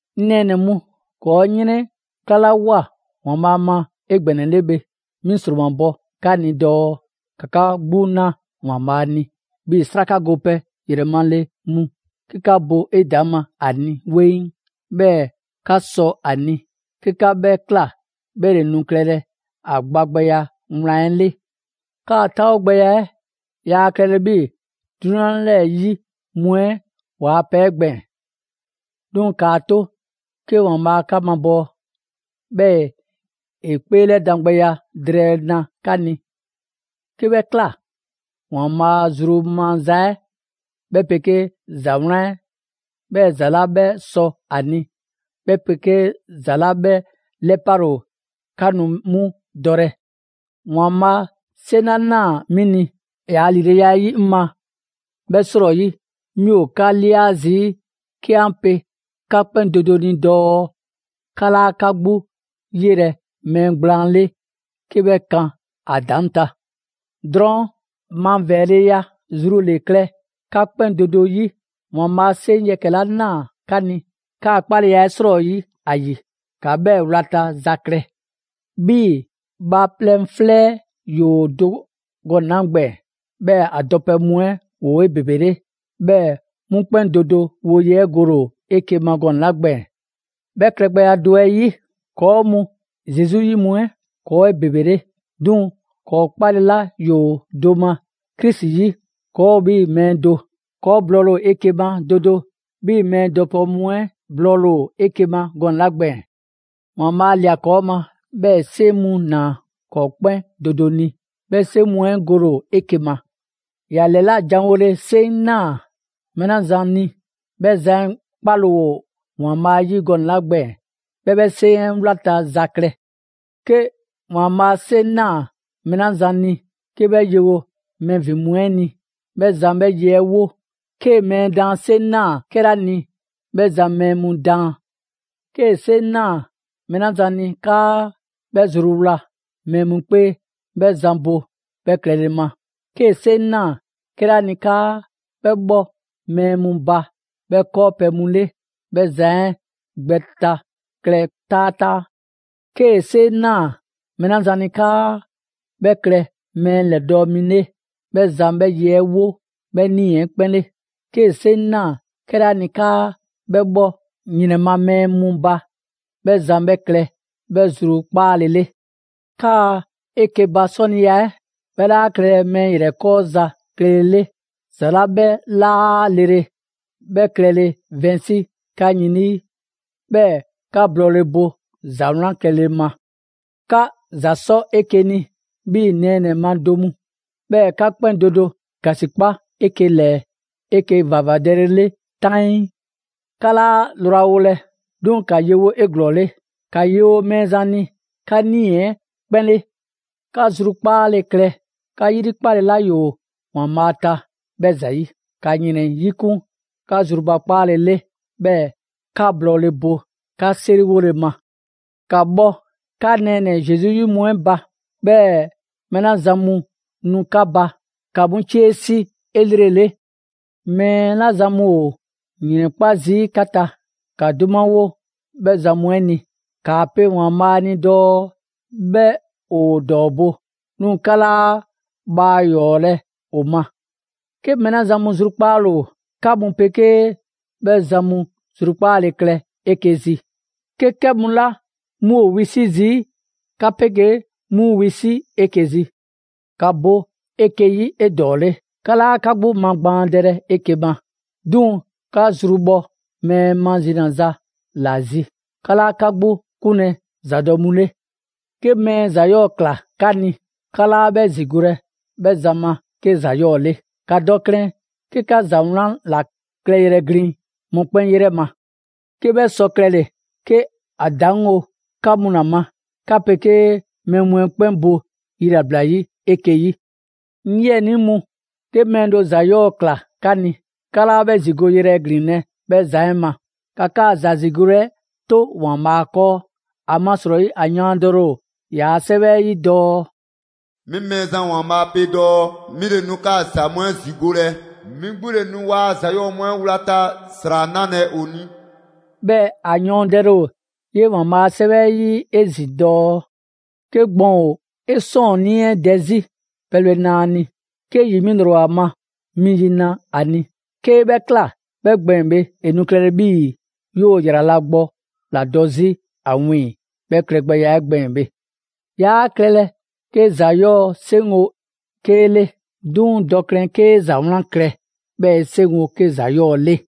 'Ŋ nɛɛnɛ‑ mu, ‑kɔɔ' 'yrɛnklalawoa ‑Waanbhaa' ma 'egbɛnɛle bhe, 'mi ‑sromabɔ 'ka ni dɔɔ ‑ka 'ka 'gbu 'na ‑Waanbhaa' ni 'bhii‑ 'sraka gopɛ ‑yrɛmale mu, 'ke 'ka bo 'edaŋma ‑a ni 'weŋ, 'bhɛɛ‑ 'ka sɔ ‑a ni. 'Ke 'ka 'bhɛ ꞊kla, 'bhɛ ‑le nu klɛlɛ ‑a gba gbɛya wlan 'ɛ 'le. 'Kaa‑ 'taawogbɛya 'ɛ yaa klɛlɛ 'bhii‑ 'drunyan 'lɛɛ‑ 'yi mu 'ɛ ‑waa' pɛ 'ɛ gbɛɛn‑. 'Duŋ‑ ‑kaa 'to 'ke ‑Waanbhaa' 'ka mabɔɔ, 'bhɛɛ‑ ‑e 'kpeelɛdangbɛya drɛɛ na 'ka ni. 'Ke 'bhɛ ꞊kla, ‑Waanbhaa' zru maza 'ɛ, 'bhɛ 'pegee ‑za 'wlan 'ɛ, 'bhɛɛ‑ ‑za 'la 'bhɛ sɔ ‑a ni, 'bhɛ 'pegee ‑za 'la 'bhɛ 'lɛpale ‑o, 'ka nu 'mu dɔlɛ. ‑Waanbhaa' 'seŋ 'la ꞊naa 'mi ni ‑yaa' ‑lileya 'ɛ 'yi 'ŋ ma 'bhɛ 'srɔyi, 'mi ‑o 'ka ꞊lia zii' 'ke 'an pe 'ka 'kpɛn do do ni dɔɔ 'ka 'laa 'ka 'gbu 'yelɛ‑ mɛɛ gblaan 'le 'ke 'bhɛ kan ‑a ‑daŋ' ta. Drɔɔn' mavɛɛleya zru ‑le klɛ 'ka 'kpɛn do do 'yi. ‑Waanbhaa' 'seŋ yɛkɛ‑ 'la ꞊naa 'ka ni, 'kaa‑ 'kpaleya 'ɛ 'srɔyi ‑a ‑yi, ‑ka 'bhɛɛ‑ wlata za klɛ. 'Bhii‑ bhaaplɛŋ 'flɛ 'ɛ ‑yoo do gɔnɛ‑ 'la gbɛɛn‑, 'bhɛɛ‑ ‑a dɔpɛ mu 'ɛ ‑woo 'ebebele; 'bhɛɛ‑ 'mu 'kpɛn do do woye 'ɛ gole ‑o 'eke‑ ma gɔnɛ‑ 'la gbɛɛn‑. 'Bhɛ klɛgbɛya do 'ɛ 'yi, ‑kɔɔ' mu Zesu 'yi mu 'ɛ, ‑kɔɔ' ‑o 'ebebele; 'duŋ‑ ‑kɔɔ' 'kpale‑ 'la ‑yoo do ma Krisi 'yi, ‑kɔɔ' ‑o 'bhii‑ mɛɛ do. ‑Kɔɔ' blɔɔle ‑o 'eke‑ ma do do 'bhii‑ mɛɛ dɔpɛ mu 'ɛ blɔɔle ‑o 'eke‑ ma gɔnɛ‑ 'la gbɛɛn‑. ‑Waanbhaa' ꞊lia ‑kɔɔ' ma, 'bhɛɛ‑ ‑e 'seŋ mu ꞊naa ‑kɔɔ' 'kpɛn do do ni, 'bhɛ 'seŋ mu 'ɛ gole ‑o 'eke‑ ma. ‑Ya ‑lɛlajanwole 'seŋ ꞊naa mɛɛ 'la zan ni, 'bhɛ zan 'ɛ 'kpale‑ ‑o ‑Waanbhaa' 'yi gɔnɛ‑ 'la gbɛɛn‑, 'bhɛ 'bhɛ 'seŋ 'ɛ wlata za klɛ. 'Ke ‑Waanbhaa' 'seŋ ꞊naa mɛɛ 'la zan ni 'ke 'bhɛ yewo 'bhɛ ‑vin mu 'ɛ ni, 'bhɛ zan 'bhɛ ye 'ɛ 'wo. 'Kee‑ mɛɛ daan 'seŋ ꞊naa 'kɛla ni, 'bhɛ zan mɛɛ mu daan. 'Kee‑ 'seŋ ꞊naa mɛɛ 'la zan ni 'kaa 'bhɛ zruwla mɛɛ mu 'kpee, 'bhɛ zan bo 'bhɛ klɛle ma. 'Kee‑ 'seŋ ꞊naa 'kɛla ni 'kaa 'bhɛ bhɔ mɛɛ mu ba 'bhɛ 'kɔɔpɛ‑ mu 'le, 'bhɛ zan 'ɛ gbɛ ta klɛ taataa. 'Kee‑ 'seŋ ꞊naa mɛɛ 'la zan ni 'kaa 'bhɛ klɛ mɛɛ mu ‑lɛdɔɔ' mi 'le, 'bhɛ zan 'bhɛ ye 'ɛ 'wo 'bhɛ 'nii‑ 'ɛ 'kpɛn 'le. 'Kee‑ 'seŋ ꞊naa 'kɛla ni 'kaa 'bhɛ 'bhɔ ‑yrɛn ma mɛɛ mu ba, 'bhɛ zan 'bhɛ klɛ 'bhɛ zrukpaalele. 'Kaa 'eke‑ ba 'sɔniya 'ɛ, 'bhɛ 'laa klɛlɛ mɛɛ ‑yrɛkɔɔza klɛle 'le. ‑Za 'la 'bhɛ 'laa lele 'bhɛ klɛle vɛnsi 'ka yin 'lii, 'bhɛɛ‑ 'ka blɔɔle bo ‑za 'wlan klɛle ma. 'Ka ‑za sɔ 'eke‑ ni 'bhii‑ nɛɛnɛ‑ ma do mu. 'Bhɛɛ‑ 'ka 'kpɛn do do ‑gasikpa 'eke‑ ‑lɛɛ 'eke‑ ‑vavadɛlele 'taŋii. 'Ka 'laa lrwawolɛ, 'duŋ‑ ‑ka yewo 'eglɔɔle. ‑Ka yewo Mɛɛzan ni 'ka 'nii‑ 'ɛ 'kpɛn 'le. 'Ka zrukpaale klɛ 'ka 'yrikpale 'la ‑yoo ‑Waanbhaa' ta 'bhɛ ‑zayi'. ‑Ka ‑yrɛn 'yikun 'ka zrubakpaale 'le, 'bhɛɛ‑ 'ka blɔɔle bo 'ka 'seriwole ma. ‑Ka bhɔ 'ka nɛɛnɛ‑ Zesu 'yi mu 'ɛ ba. 'Bhɛɛ‑ mɛɛ 'la zan mu nu 'ka ba, ‑ka 'mu 'cie 'si 'elrele. Mɛɛ 'la zan mu ‑o ‑yrɛnkpa' zii' 'ka ta, ‑ka 'dumawo 'bhɛ zan mu 'ɛ ni. ‑Kaa pe ‑Waanbhaa' ni dɔɔ 'bhɛ ‑o ‑dɔɔbo', 'duŋ‑ 'ka 'laa bhaa ‑yɔɔlɛ' ‑o ma. 'Ke mɛɛ 'la zan mu zrukpaale ‑o, 'ka mu 'pegee 'bhɛ zan mu zrukpaale klɛ 'eke‑ zi. 'Ke 'kɛ mu la 'mu ‑o wisi' zii', 'ka 'pegee 'mu wisi' 'eke‑ zi. ‑Ka bo 'eke‑ 'yi 'edɔɔle. 'Ka 'laa 'ka 'gbu magbaandɛlɛ 'eke‑ ma, 'duŋ‑ 'ka zru bhɔ mɛɛ mazinaza ‑la zi. 'Ka 'laa 'ka 'gbu 'kunlɛ‑ ‑zadɔ' mu 'le. 'Ke mɛɛ ‑za 'yɔɔ‑ ꞊kla 'ka ni, 'ka 'laa 'bhɛ ‑zigolɛ 'bhɛ zan ma 'ke ‑za 'yɔɔ‑ 'le. ‑Ka dɔ klɛn 'ke 'ka ‑za 'wlan ‑la klɛyrɛ glin mɔkpɛn' 'yrɛ ma. 'Ke 'bhɛ sɔ klɛle‑, 'ke ‑a ‑daŋgo' 'ka mu ‑la ma, 'ka 'pegee mɛɛ mu 'ɛ 'kpɛn bo yilabla 'yi 'eke‑ 'yi. 'Ŋ 'yiɛnii mu, 'ke mɛɛ do ‑za 'yɔɔ‑ ꞊kla 'ka ni, 'ka 'laa 'bhɛ ‑zigoyrɛ ‑glinlɛ' 'bhɛ zan 'ɛ ma. ‑Ka 'kaa‑ ‑za ‑zigole 'ɛ 'to ‑Waanbhaa' 'kɔɔ. ‑Amasrɔyi ‑a yɔɔndɛle ‑o ‑yaa' 'Sɛwɛ 'ɛ 'yi dɔɔ: «'Mi Mɛɛzan ‑Waanbhaa' pe dɔɔ 'mi ‑le nu 'kaa‑ ‑za mu 'ɛ ‑zigolɛ, 'mi 'gbu ‑le nu ‑waa' ‑za 'yɔɔ‑ mu 'ɛ 'wlata‑ ‑sra 'nalɛ‑ ‑o ni.» 'Bhɛɛ‑ ‑a yɔɔndɛle ‑o 'yee‑ ‑Waanbhaa' a 'Sɛwɛ 'ɛ 'yi 'ezin‑ dɔɔ: «'Ke gbɔn ‑o 'e 'sɔɔnnii 'ɛ dɛ 'zi, pɛbhle na ‑a ni. 'Ke ‑yi 'mi ‑lrɔ ‑o ‑a ma, mi yi na ‑a ni. 'Kee‑ 'bhɛ ꞊kla 'bhɛ gbɛɛn‑ bhe, ‑e nu klɛlɛ 'bhii‑ 'yoo‑ ‑yrala' gbɔ ‑la dɔ 'zi ‑a wiiŋ‑ 'bhɛ klɛgbɛya 'ɛ gbɛɛn‑ bhe.» 'Yaa klɛlɛ 'ke ‑za 'yɔɔ‑ 'seŋgo‑ 'kee 'le. 'Duŋ‑ dɔ klɛn 'kee‑ ‑za 'wlan klɛ 'bhɛɛ‑ 'e 'seŋgo‑ 'ke ‑za 'yɔɔ‑ 'le.